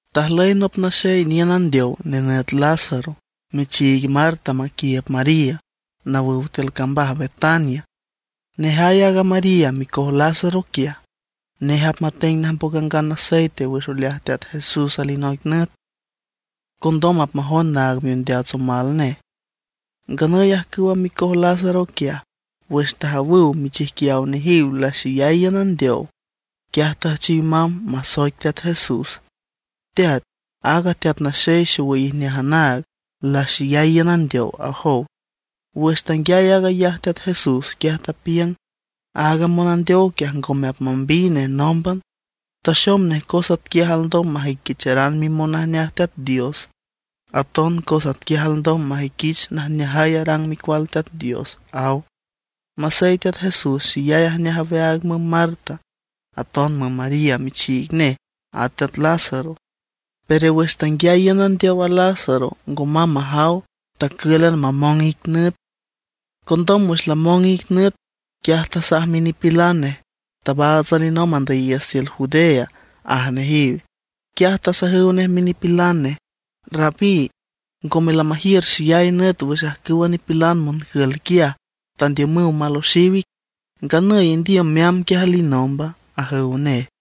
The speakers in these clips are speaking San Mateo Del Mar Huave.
Tajlüy nop naxey niün andeow, nenüt Lázaro, michiig Marta maquiiüb María, nawüw tiül cambaj Betania. Aaga María micoj Lázaro quiaj, nej apmateng najmboc angan aceite wüx oleaj Teat Jesús alinoic nüt, condom apmajond naag miondeats omal nej. Nganüy ajcüwa micoj Lázaro quiaj, wüx tajawüw michijquiaw nejiw laxeyay iün andeow, quiaj tüjchiw mamb masoic Teat Jesús: ―Teat, aaga teat naxey xowüy ijneaj anaag laxeyay iün andeow ―ajow. Wüx tanguiay aag ayaj Teat Jesús, quiaj tapiüng: ―Aaga monandeow quiaj ngome apmambiy nej nómban. Taxom nej cos atquiaj alndom majüiquicharan mimonajneaj Teat Dios; aton cos atquiaj alndom majüiquich najneajay arang Micual Teat Dios ―aw. Masey Teat Jesús xeyay ajneaj aweaag müm Marta, aton müm María michiig nej, at teat Lázaro; pero wüx tanguiay iün andeow a Lázaro, ngo mamb majaw, tacǘlan mamong ic nüt. Condom wüx lamong ic nüt, quiaj tasaj minipilan nej: ―Tabaats alinomb andüyiiüts tiül Judea ―aj nejiw. Quiaj tasajüw nej minipilan nej: ―Rabí, ngome lamajiür xeyay nüt wüx ajcüwa nipilan moncül quiaj tandiümüw maloxiw ic, nganüy ¿indiüm meamb quiaj alinomba? ―ajüw nej.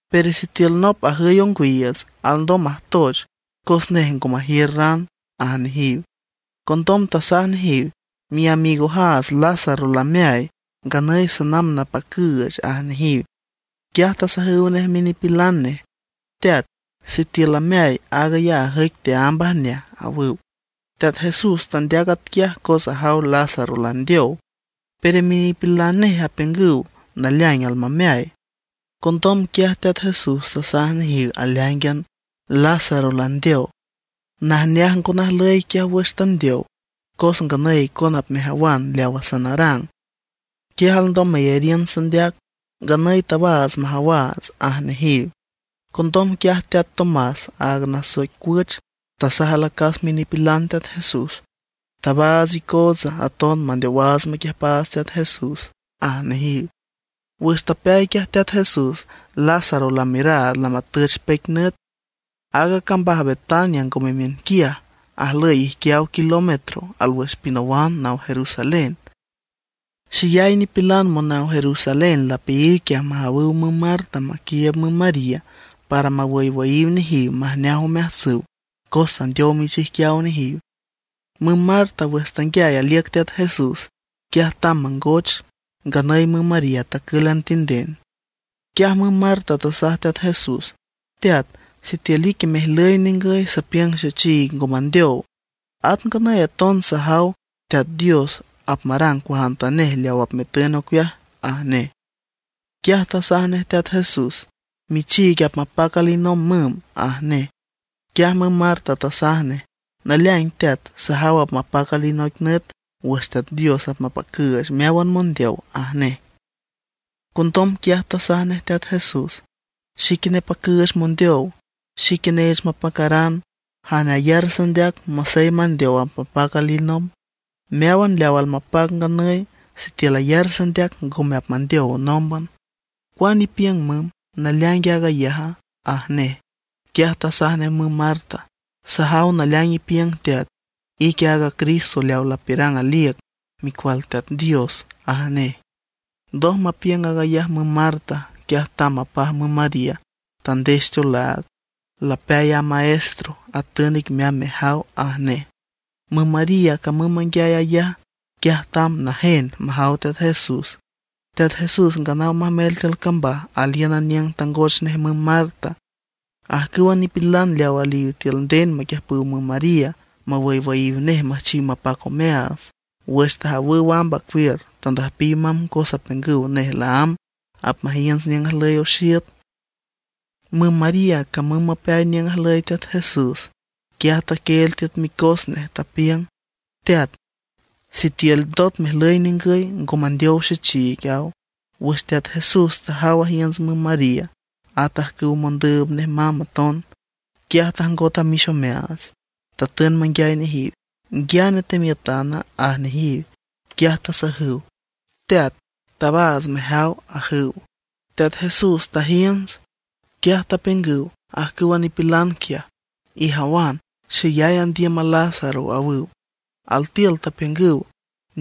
Pero sitiül nop ajüy ongwiiüts, alndom majtoch, cos nej ngo majiür ran ―aj nejiw. Condom tasaj nejiw: ―Miamigojaats Lázaro lameay, nganüy sanamb napacüüch ―aj nejiw. Quiaj tasajüw nej minipilan nej: ―Teat, sitiül lameay, aag ayaj ajüic teaámb ajneaj ―awüw. Teat Jesús tandeac atquiaj cos ajaw Lázaro landeow; pero minipilan nej apiüngüw naleaing almameay. Condom quiaj Teat Jesús tasaj nejiw aleáingan: ―Lázaro landeow. Najneaj ngo najlüy quiaj wüx tandeow, cos nganüy icona apmejawan leawa sanarang, quiaj alndom meyariün sandeac. Nganüy tabaats majawaats ―aj nejiw. Condom quiaj teat Tomás, aaga nasoic Cuüch, tasaj alacas minipilan Teat Jesús: ―Tabaats icoots aton mandeowaats maquiüjpaats Teat Jesús ―aj nejiw. Wüx tapeay quiaj Teat Jesús, Lázaro lamiüraad lamatüch peic nüt. Aaga cambaj Betania ngome miünquiaj, ajlüy ijquiaw kilómetro alwüx pinawan naw Jerusalén. Xeyay nipilan monaw Jerusalén lapeayiw quiaj majawüw müm Marta maquiiüb müm María, para mawüywüyiw nejiw majneaj omeajtsüw, cos tandeow michijquiaw nejiw. Müm Marta wüx tanguiay aliüc Teat Jesús, quiaj tamb mangoch; nganüy müm María tacǘlan tinden. Quiaj müm Marta tasaj Teat Jesús: ―Teat, sitiül ique mejlüy ningüy sapiüng xechiig ngo mandeow. At nganüy aton sajaw Teat Dios apmarang cuajantanej leaw apmetün ocueaj ―aj nej. Quiaj tasaj nej Teat Jesús: ―Michiig apmapac alinomb müm ―aj nej. Quiaj müm Marta tasaj nej: ―Naleaing teat, sajaw apmapac alinoic nüt wüx Teat Dios apmapacüüch meáwan mondeow ―aj nej. Condom quiaj tasaj nej Teat Jesús: ―Xique nepacüüch mondeow, xique neech mapacaran. Jane ayar sandeac masey mandeow apmapac alinomb. Meáwan leaw almapac nganüy, sitiül ayar sandeac ngome apmandeow nómban. ¿Cuane ipiüng müm, naleaingue aag ayaja? ―aj nej. Quiaj tasaj nej müm Marta: ―Sajaw naleaing ipiüng Teat, ique aaga Cristo leaw lapiürang aliüc, Micual Teat Dios ―aj nej. Ndoj mapiüng aag ayaj müm Marta, quiaj tamb mapaj müm María, tandex teolaag: ―Lapeay a Maestro, atün ic meamb mejaw ―aj nej. Müm María camüm manguiay ayaj, quiaj tamb najen majaw Teat Jesús. Teat Jesús nganaw majmel tiül cambaj, alíünan niüng tangoch nej müm Marta. Ajcüwa nipilan leaw aliw tiül nden maquiüjpüw müm María mawüywüyiw nej müjchiw mapac omeaats, wüx tajawüw amb acuiür tandüjpiw mamb cos apiüngüw nej laámb apmajiünts niüng ajlüy oxiüt. Müm María camüm mapeay niüng ajlüy Teat Jesús, quiaj taquieel tiüt micos nej, tapiüng: ―Teat, sitiül ndot mejlüy ningüy ngo mandeow xechiig ―aw. Wüx Teat Jesús tajaw ajiünts müm María, at ajcüwa mondüüb nej mamb aton, quiaj tajngot amix omeaats. Tatün manguiay nejiw: ―¿Nguiane temiütana? ―aj nejiw. Quiaj tasajüw: ―Teat, tabaats mejaw ―ajüw. Teat Jesús tajiünts. Quiaj tapiüngüw ajcüwa nipilan quiaj: ―Ijawan, xeyay andiüm a Lázaro ―awüw. Altiül tapiüngüw: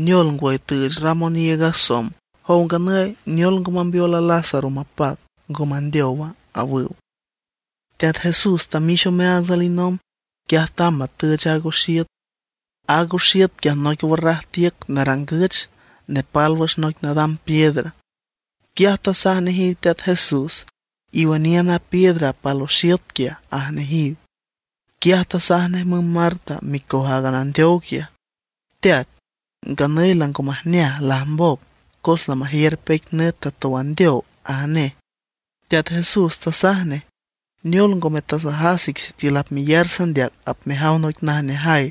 ―Neol ngwüy, tüüch ram oniiüg a somb, jow nganüy, ¿neol ngo mambeol a Lázaro mapac, ngo mandeowa? ―awüw. Teat Jesús tamix omeaats alinomb, quiaj tamb matüch aaga oxiüt. Aaga oxiüt quiaj noic warraj tiüc narangüch, nepal wüx noic nadam piedra. Quiaj tasaj nejiw Teat Jesús: ―Iwüniün a piedra apal oxiüt quiaj ―aj nejiw. Quiaj tasaj nej müm Marta, micoj aaga nandeow quiaj: ―Teat, nganüy lango majneaj, lajmboc, cos lamajiür peic nüt tatow andeow ―aj nej. Teat Jesús tasaj nej: ―¿Neol, ngome tasajas ic sitiül apmeyar sandeac apmejaw noic najneajay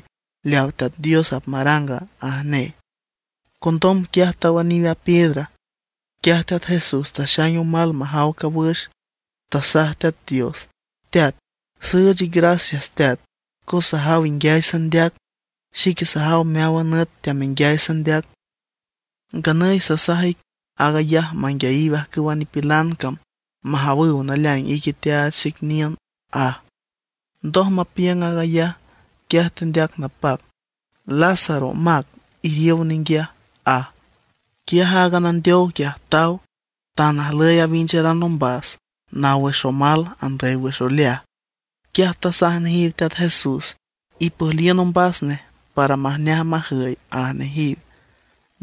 leaw Teat Dios apmaranga? ―aj nej. Condom quiaj tawüniw a piedra. Quiaj Teat Jesús taxaing omal majaw cawüx, tasaj Teat Dios: ―Teat, süüch ic gracias Teat, cos sajaw inguiay sandeac. Xique sajaw meáwan nüt teamenguiay sandeac. Nganüy sasaj ic aag ayaj manguiayiw ajcüwa nipilan cam, majawüw naleaing ique teaach xic niün ―aj. Ndoj mapiüng aag ayaj, quiaj tendeac napac: ―¡Lázaro, mac, iriow ninguiaj! ―aj. Quiaj aaga nandeow quiaj taw, tan ajlüy awincharan ombas, naw wüx omal andüy wüx oleaj. Quiaj tasaj nejiw Teat Jesús: ―Ipüjliün ombas nej para majneaj majüy ―aj nejiw.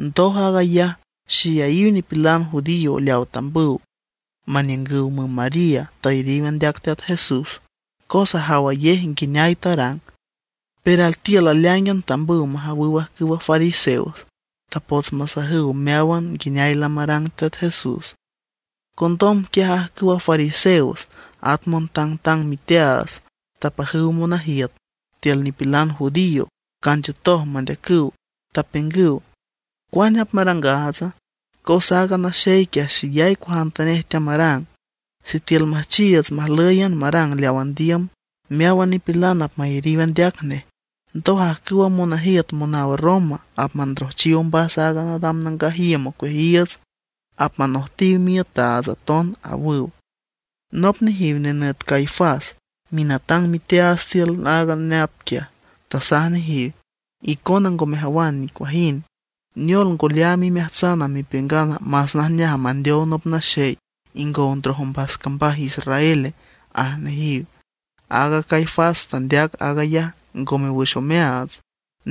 Ndoj aag ayaj, xeyayiw nipilan judío leaw tambüw maniüngüw müm María tayariw andeac Teat Jesús, cos ajawayej nguineay tarang. Pero altiül aleáingan tambüw majawüw ajcüwa fariseos. Tapots masajüw meáwan nguineay lamarang Teat Jesús. Condom quiaj ajcüwa fariseos, at montangtang miteaats, tapajüw monajiüt tiül nipilan judío canchiütoj mandeacüw, tapiüngüw: ―¿Cuane apmarangaatsa? Cos aaga naxey quiaj xeyay cuajantanej teamarang. Sitiül müjchiiüts majlǘyan marang leaw andiüm, meáwan nipilan apmayariw andeac nej; ndoj ajcüwa monajiüt monaw Roma apmandrojchiw ombas aaga nadam nangaj iüm ocueajiiüts; apmanojtiw miiütaats aton ―awüw. Nop nejiw nenüt Caifás, minatang miteaats nej tiül aaga neat quiaj, tasaj nejiw: ―Icona ngo mejawan nicuajind. Neol ngo leaam imeajtsan mepiüngan más najneaj mandeow nop naxey ingow ndroj ombas cambaj Israel ―aj nejiw. Aaga Caifás tandeac aag ayaj ngome wüx omeaats.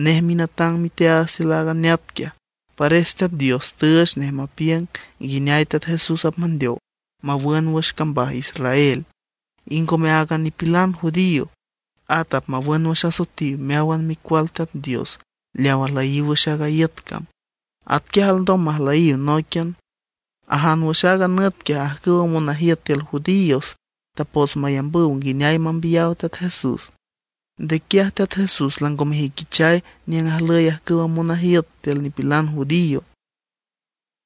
Nej minatang miteaats tiül aaga neat quiaj, pares Teat Dios tüüch nej mapiüng nguineay Teat Jesús apmandeow mawün wüx cambaj Israel. Y ngome áagan nipilan judío, at apmawün wüx asoetiw meáwan micual Teat Dios leaw ajlüyiw wüx aaga iüt cam. Atquiaj alndom majlüyiw nóiquian. Ajan wüx aaga nüt quiaj ajcüwa monajiüt tiül judíos tapots mayambüw nguineay mambiyaw Teat Jesús. Nde quiaj Teat Jesús lango mejüiquichay niüng ajlüy ajcüwa monajiüt tiül nipilan judío;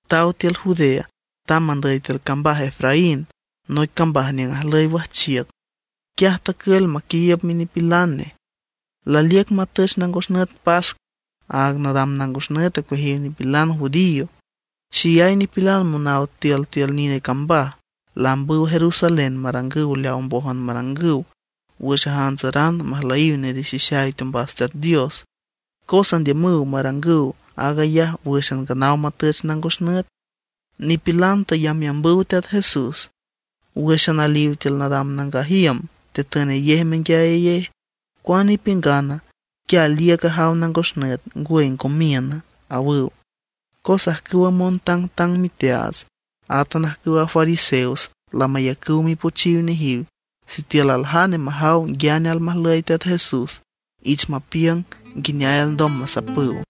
taw tiül Judea, tamb andüy tiül cambaj Efraín, noic cambaj niüng ajlüy wajchiüc. Quiaj tacül aquiiüb minipilan nej. Laliüc matüch nangos nüt pascua, aaga nadam nangos nüt ocueajiw nipilan judío. Xeyay nipilan monaw tiültiül nine cambaj laambüw Jerusalén marangüw leaw mbójan marangüw wüx ajantsaranüw majlüyiw nerixixay teombas Teat Dios. Cos andiümüw marangüw aag ayaj wǘxan nganaw matüch nangos nüt. Nipilan tayambyambüw Teat Jesús. Wǘxan aliw tiül nadam nangaj iüm tetünayej menguiayayej: ―¿Cuane ipiüngana? ¿Quia aliüc ajaw nangos nüt, ngwüy ngo miüna? ―awüw. Cos ajcüwa montangtang miteaats, átan ajcüwa fariseos lamayacüw mipochiw nejiw sitiül aljane majaw nguiane almajlüy Teat Jesús, ich mapiüng nguineay alndom masapüw.